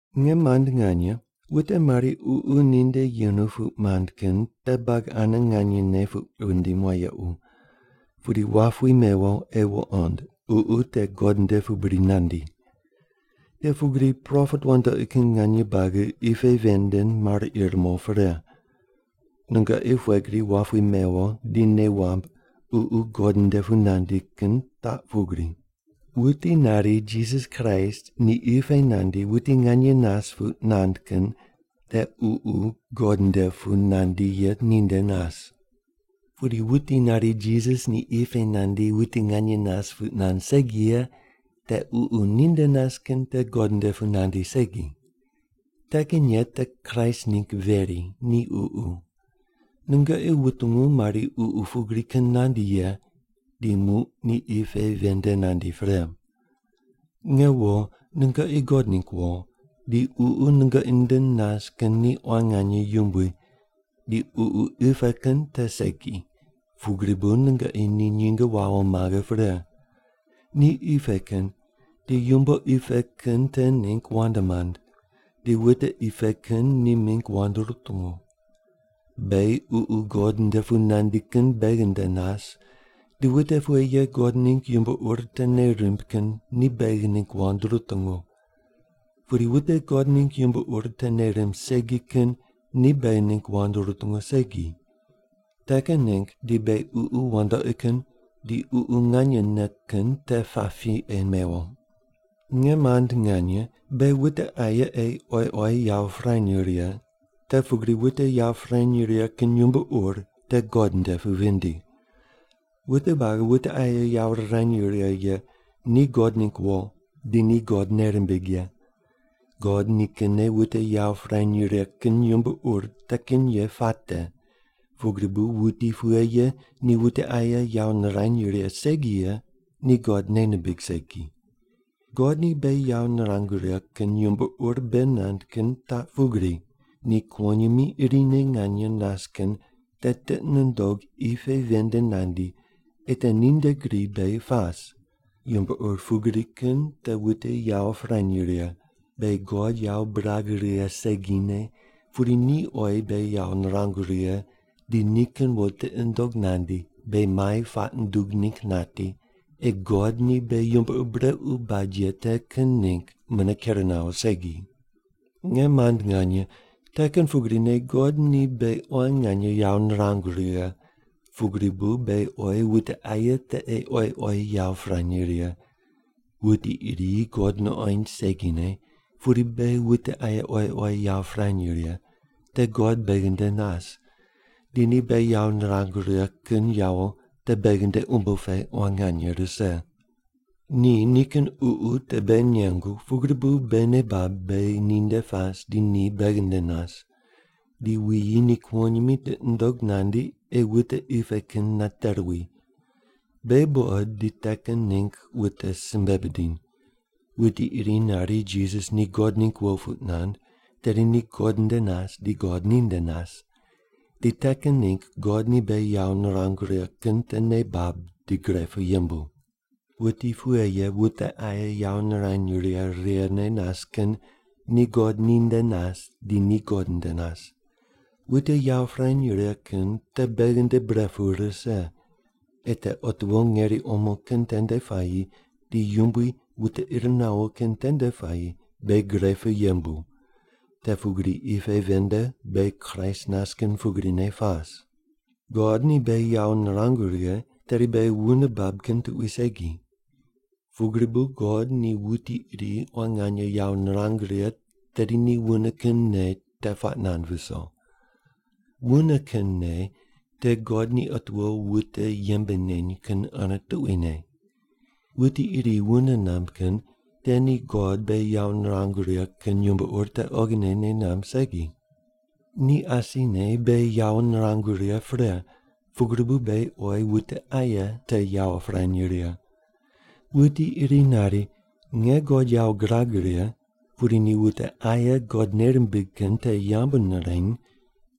Nge mand nganye, wute mari ququ ninde yenu puq mand kin te buagi ane nganyene puq wundim wayequ, pudi wap wi mewo ei wuqond ququ te God nde pu bri nandi. Te pugri propet wandoqi kin nganye buagi qi pe ven nde mar ir mo pre. Nungoqi pughe gri wap wi mewo di nei wamb Ququ God nde pu nandi kin taq pugri: Wuti nari Jisas Kraist ni qi pe nandi wuti nganye nas puq nand kin te Ququ God nde pu nandi ye ninde nas. Pudi wuti nari Jisas ni qi pe nandi wuti nganye nas puq nand segi ye te ququ ninde nas kin te God nde pu nandi segi. Te kin ye te Kraist ningg veri ni ququ. Nungoqi wutungu mari ququ pugri kin nandi ye, di muq ni qi pe ven nde nandi pre. Nge wo, nungoqi God ningg wo, di Ququ nungoqi nde nas kin ni quan nganye yumbui, di ququ qi pe kin te segi, pugri bu nungoqi ni nyinge wawo maghe pre. Ni qi pe kin, di yumbo qi pe kin te ningg wand mand, di wute qi pe kin ni mingg wand rutungu. Beghi Ququ God nde pu nandi kin beghi nde nas, di wute pughe ye God ningg yumbo ur te nei rimb kin ni beghi ningg wand rutungu. Pudi wute God ningg yumbo ur te nei rimb segi kin ni beghi ningg wand rutungu segi. Te kin ningg di beghi ququ wandoqi kin di Ququ nganyene kin te pap pi ei mewo. Nge mand nganye, beghi wute aye ei oyi oyi yawo pirany righe, te pugri wute yawo pirany righe kin yumbo ur te God nde pu vindi. Wute buagi wute aye yawo rirany righe ye ni God ningg wo, di ni God nei rimbig ye. God nikinne wute yawo pirany righe kin yumbo ur te kin ye puate, pugri bu wuti pughe ye ni wute aye yawo nirany righe segi ye ni God nei nimbig segi. God ni beghi yawo nirangu righe kin yumbo ur bei nand kin taq pugri: Ni kuwonyimi irine nganye nas kin te tiqi nundog qi pe ven nde nandi ei te ninde gri beghi pas. Yumbo ur pugri kin te wute yawo pirany righe: Beghi God yawo birag righe segine, pudi ni oyi beghi yawo nirangu righe di nikin wo tiqi nundog nandi beghi mai puaq nundug ningg nati ei God ni beghi yumbo ur brequ bad ye te kin ningg mune ker nawo segi. Nge mand nganye, te kin pugrine God ni beghi quan nganye yawo nirangu righe, pugri bu beghi oyi wute aye te ei oyi oyi yawo pirany righe. Wuti iri God nuqoind segine, pudi beghi wute aye oyi oyi yawo pirany righe, te God beghi nde nas, di ni beghi yawo nirangu righe kin yawo te beghi nde umbo pe quan nganye rise. Ni nikin Ququ te beghi nengu, pugri bu beghi nei bab beghi ninde pas di ni beghi nde nas. Di wuyi ni kuwonyimi tiqi nundog nandi ei wute qi pe kin nate ruwi. Beghi buqod di te kin ningg wute simbe bidiny. Wuti iri nari Jisas ni God ningg wo puq nand, tedi ni God nde nas di God ni nde nas. Di te kin ningg God ni beghi yawo nirangu righe kin te nei bab di gre pu yembu. Wuti pughe ye wute aye yawo nirany righe righene nas kin ni God ninde nas di ni God nde nas. Wute yawo pirany righe kin te beghi nde bre pu rise, ei te otiwo ngeri omo kin tende puayi di Yumbui wute ir nawo kin tende puayi beghi gre pu yembu, te pugri qi pe ven nde beghi Kraist nas kin pugrine pas. God ni beghi yawo nirangu righe, tedi beghi wune bab kin tuqui segi. Pugri bu God ni wuti iri quan nganye yawo nirang righe tedi ni wune kin nei te puaq nand viso. Wune kin nei te God ni otiwo wute yembe neny kin ane tuquine. Wuti iri wune namb kin te ni God beghi yawo nirangu righe kin yumbo ur te oghine nei namb segi. Ni asine beghi yawo nirangu righe pre, pugri bu beghi oyi wute aye te yawo pirany righe. Wuti iri nari, “Nge God yawo girag righe,” pudi ni wute aye God nei rimbig kin te yambu nireny,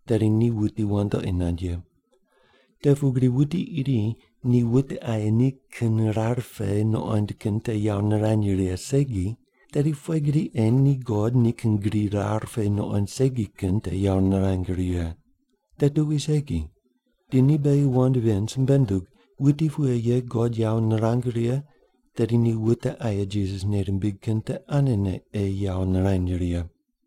tedi ni wuti wandoqi nand ye. Te pugri wuti iri ni wute aye nikin rar pe nuqond kin te yawo nirany righe segi, tedi pughe gri ei ni God nikin gri rar pe nuqoind segi kin te yawo nirang righe? Te tuqui segi. Di ni beghi wand ven simbe nundug: Wuti pughe ye God yawo nirang righe, tedi ni wute aye Jisas nei rimbig kin te anene ei yawo nirany righe.